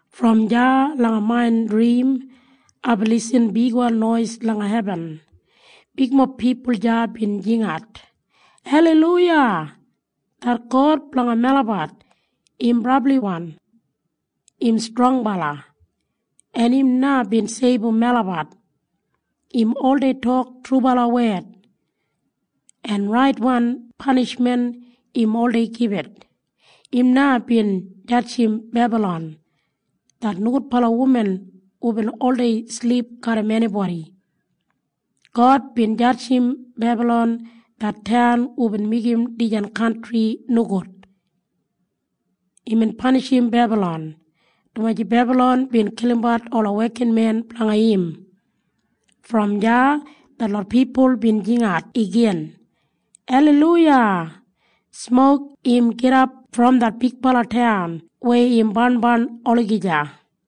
Brom deya langa main drim aibin lisin bigwan nois langa hebin. Bigmob pipul deya bin jingat, “Aleiluya! Det God blanga melabat im brabliwan! Im strongbala, en im na bin seibum melabat! Im oldei tok trubala wed, en raitwan panishmen im oldei gibit. Im na bin jadjim Bebalon, det nogudbala wuman hubin oldei silip garram enibodi. God bin jadjim Bebalon det taun hubin meigim dijan kantri nogud. Imbin panishim Bebalon, dumaji Bebalon bin kilimbat ola wekinmen blanga im.” Praise Brom deya detlot pipul bin jingat igin, “Aleiluya! Smok im gidap brom det bigbala taun weya im barnbarn olagija!”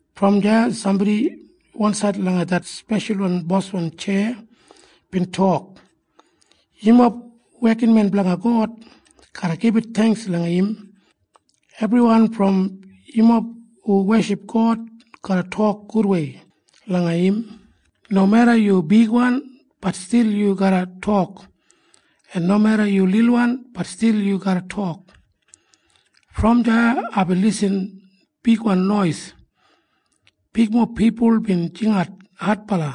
Brom deya sambodi wansaid langa det speshal boswan tjeya bin tok, “Yumob wekinmen blanga God garra gibit theingks langa im. Ebriwan brom yumob hu weship God garra tok gudwei langa im. Nomeda yu bigwan, bat stil yu garra tok, en nomeda yu lilwan, bat stil yu garra tok.” Brom deya aibin lisin bigwan nois. Bigmob pipul bin jingat adbala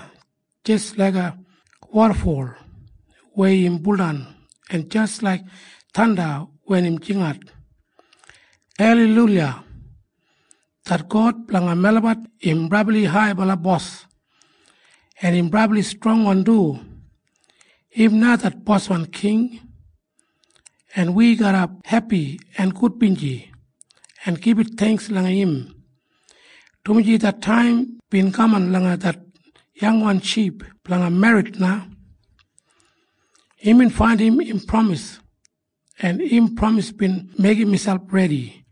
jis laiga wodafol weya im buldan en jis laik thanda wen im jingat, “Aleiluya! Det God blanga melabat im Brabli Haibala Bos, en im brabli strongwan du! Im na det Boswan King. En wi garra hepi en gudbinji en gibit theingks langa im, dumaji det taim bin kaman blanga det yangwan ship blanga merrit na. Imbin faindim im pramis, en im pramis bin meigim miselp redi.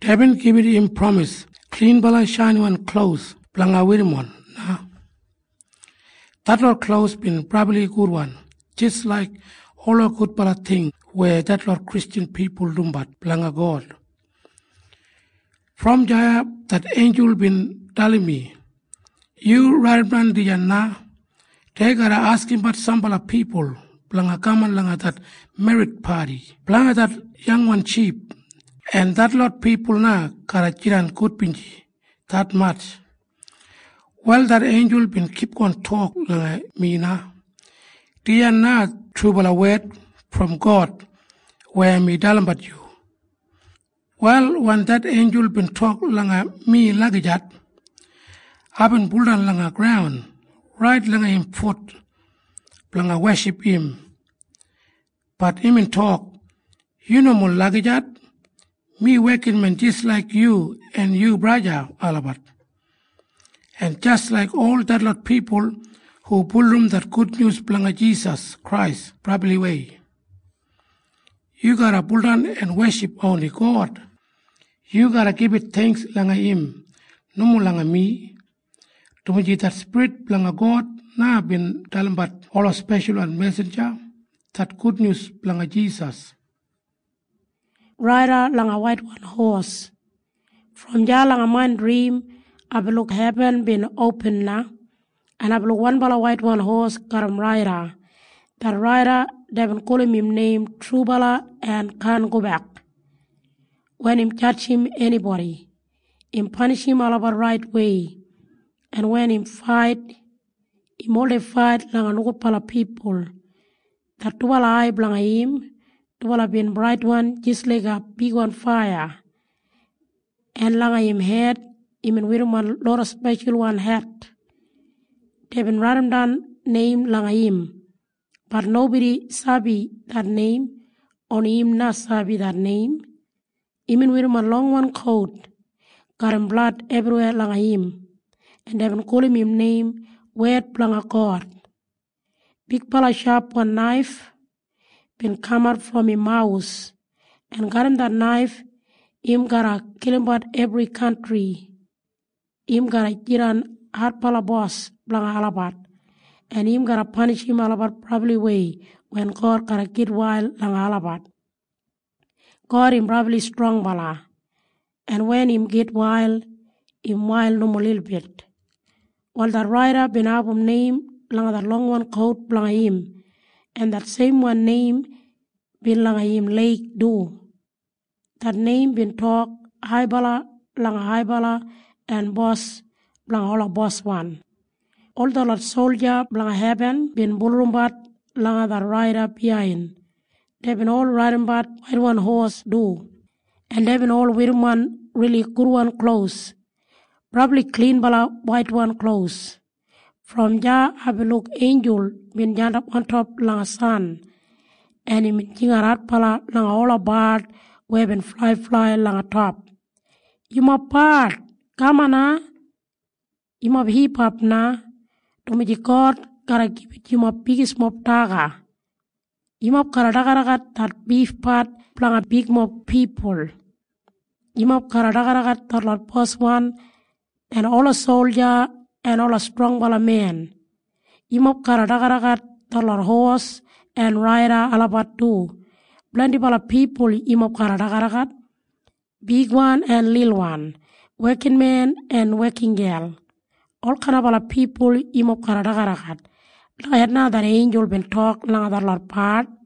Deibin gibit im pramis klinbala shainiwan klos blanga werrimon na.” Detlot klos bin brabli gudwan jis laik ola gudbala ting weya detlot Kristjan pipul dumbat blanga God. Brom deya det einjul bin dalim mi, “Yu raidimdan dijan na. Dei garra askimbat sambala pipul blanga kaman langa det merrit padi blanga det yangwan ship. En detlot pipul na garra jidan gudbinji detmatj.” Wal det einjul bin kipgon tok langa mi na, “Dijan na trubala wed brom God weya mi dalimbat yu.” Wal wen det einjul bin tok langa mi lagijat, aibin buldan langa graun rait langa im fut blanga weship im. Bat imbin tok, “Yu nomo lagijat! Mi wekinmen jis laik yu en yu braja olabat, en jis laik ol detlot pipul hu bulurrum det gudnyus blanga Jisas Krais brabliwei. Yu garra baudan en weship oni God. Yu garra gibit theingks langa im, nomo langa mi, dumaji det Spirit blanga God na bin dalimbat ola speshalwan mesinja det gudnyus blanga Jisas.” Brom deya langa main drim aibin luk hebin bin opin na, en aibin luk wanbala waitwan hos garram raida. Det raida deibin gulum im neim Trubala en Kaan Gobek. Wen im jadjim enibodi, im panishim olabat raitwei, en wen im fait, im oldei fait langa nogudbala pipul. Det dubala ai blanga im, dubala bin braitwan jis laiga bigwan faiya, en langa im hed imbin werrimon loda speshalwan het. Deibin raidimdan neim langa im. Bat nobodi sabi det neim. Oni im na sabi det neim. Imbin werrimon longwan kout garram blad ebriweya langa im, en deibin gulum im neim “Wed Blanga God.” Bigbala shapwan naif bin kamat brom im mawus, en garram det naif im garra kilimbat ebri kantri. Im garra jidan adbala bos blanga olabat, en im garra panishim olabat brabliwei wen God garra gitwail langa olabat. God im brabli strongbala, en wen im gitwail, im wail nomo lilbit. Wal det raida bin abum neim langa det longwan kout blanga im, en det seimwan neim bin langa im leig du. Det neim bin tok, “Haibala langa haibala en Bos blanga ola boswan.” Ol detlot solja blanga hebin bin bulurrumbat langa det raida biyain. Deibin ol raidimbat waitwan hos du, en deibin ol werrimon rili gudwan klos, brabli klinbala waitwan klos. Brom deya aibin luk einjul bin jandap ontop langa san, en imbin jingat adbala langa ola bard weya bin flaiflai langa top, “Yumob bard kaman na! Yumob hipap na, dumaji God garra gibit yumob bigismob daga. Yumob garra dagadagat det bifpat blanga bigmob pipul. Yumob garra dagadagat detlot boswan en ola solja en ola strongbala men. Yumob garra dagadagat detlot hos en raida olabat du. Blendibala pipul yumob garra dagadagat, bigwan en lilwan, wekinmen en wekingel. Olkain pipul yumob garra dagadagat.” Lagijat na det einjul bin tok langa detlot bard.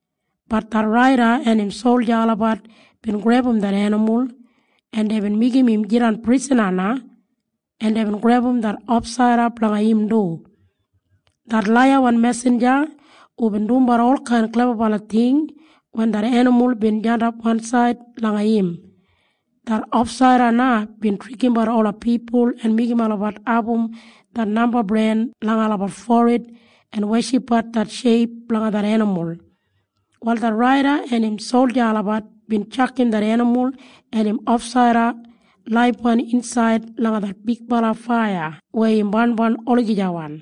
Bat det raida en im solja olabat bin grebum det enimul, en deibin meigim im jidan prisana na, en deibin grebum det ofsaida blanga im du, det laiyawan mesinja hubin dumbat olkain klebabala ting wen det enimul bin jandap wansaid langa im. Det ofsaida na bin trikimbat ola pipul en meigim olabat abum det namba bren langa olabat forid en weshipbat det sheip blanga det enimul. Wal det raida en im solja olabat bin tjakam det enimul en im ofsaida laibwan insaid langa det bigbala faiya weya im barnbarn olagijawan,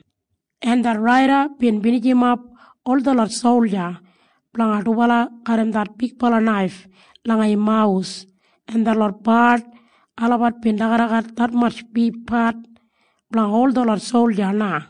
en det raida bin binijimap ol detlot solja blanga dubala garram det bigbala naif langa im mawus, en detlot bard olabat bin dagadagat detmatj bifpat blanga ol detlot solja na.